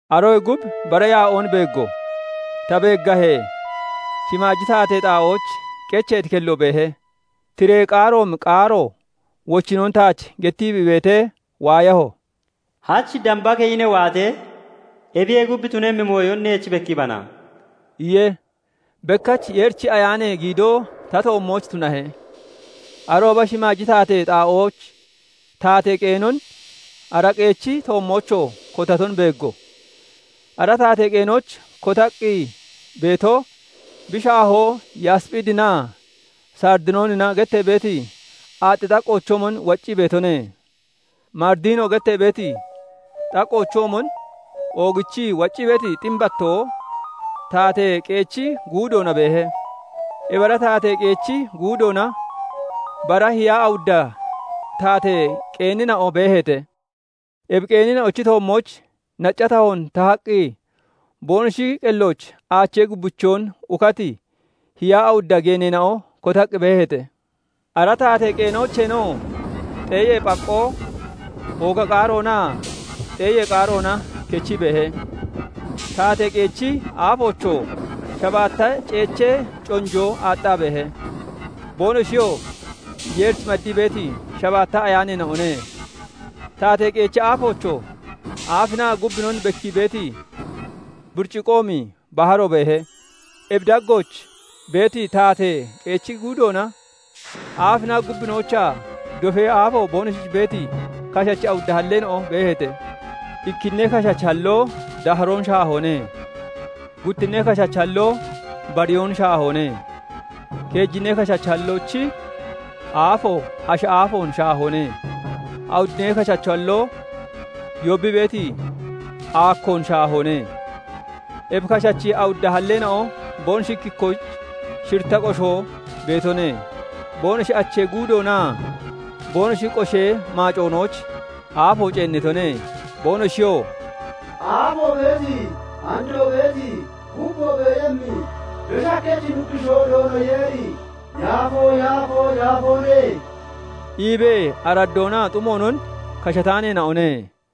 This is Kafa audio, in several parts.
Aroyee gub bara yaa'oon beeggo; ta beeggahee, shimaaji taatee xaa'ooch qecheeti kello beehe; tiree qaaroomi qaaro wochinnoon taach gettii bi beetee waayaho; "Hach damba keyi ne waatee, ebiyee gub tunemmi mooyon neech bekkiibana" iye. Bekkach Yeerichi Ayaanee giidoo ta toommooch tunahe; arooba shimaaji taatee xaa'ooch taatee qeenon, ara qeechi toommoochoo kotaton beeggo. Ara taatee qeenooch kotaqqi beeto bi shaahoo yasphiidinaa saridiyoonina gettee beeti aaxxi xaqqoochoomon waccii beetone; maridino gettee beeti xaqqoochoomon oogichii waccii beeti ximbattoo taatee qeechi guudoona beehe. Ebi ara taatee qeechi guudoona bara hiyaa awudda taatee qeenina'o beeheete; ebi qeenina'ochi toommooch nacca tahoon tahaqqi boonoshi qellooch aachee gubbichoon ukati hiyaa awudda geeneena'o kotaqqi beeheete. Ara taatee qeenoocheenoo xeeyee phaqqoo, ooga qaaroonaa xeeyee qaaroona kechii beehe; taatee qeechi aafoochoo shabaatta ceechee conjoo aaxxaa beehe; boonoshiyoo Yeerich maddii beeti shabaatta ayaaneena'one. Taatee qeechi aafoochoo aafinaa gubbinon bekkii beeti buriciqoomi baharo beehe. Ebi daggooch beeti taatee qeechi guudoona, aafinaa gubbinoochaa dofee aafo boonoshich beeti kashachi awudda halleena'o beeheete. Ikkinnee kashachi halloo daaharoon shaahoone; guttinnee kashachi halloo bariyoon shaahoone; keejinnee kashachi halloochi aafo ashi aafoon shaahoone; awuddinnee kashachi halloo yoobbii beeti aakkoon (booyon) shaahoone. Ebi kashachi awudda halleena'o boonoshi ikki ikkoyich shiritta qoshoo beetone; boonoshi achee guudoonaa boonoshi qoshee maacinooch aafo ceennitone. Boonoshiyoo "Aafoo beeti, andoo beeti, gubboo beeyemmi, Beshi Hakkachi Nuggushoo Doono Yeeri yaafoo, yaafoo, yaafoone!" iibee araddoonaa xumoonon kashataaneena'one.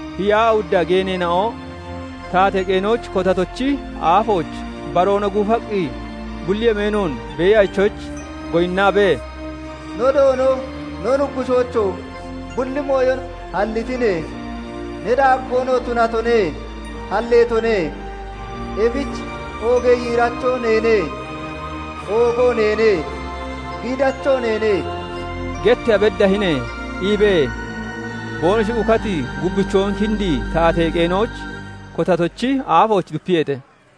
hiyaa awudda geeneena'o taatee qeenooch kotatochi aafooch baroona guufaqqi bulli yemeenoon Beeyachoyich goyinnaabee, "No Doono, no Nuggushoocho! Bulli mooyon hallitine; Ne daaggoonoo tunatone; halleetone; Ebich 'Oogee yiiracho neene; oogoo neene; Giidacho neene' getteeya beddahine iibee boonoshi ukati gubbichoon kindii taatee qeenooch kotatochi aafooch dupiyeete.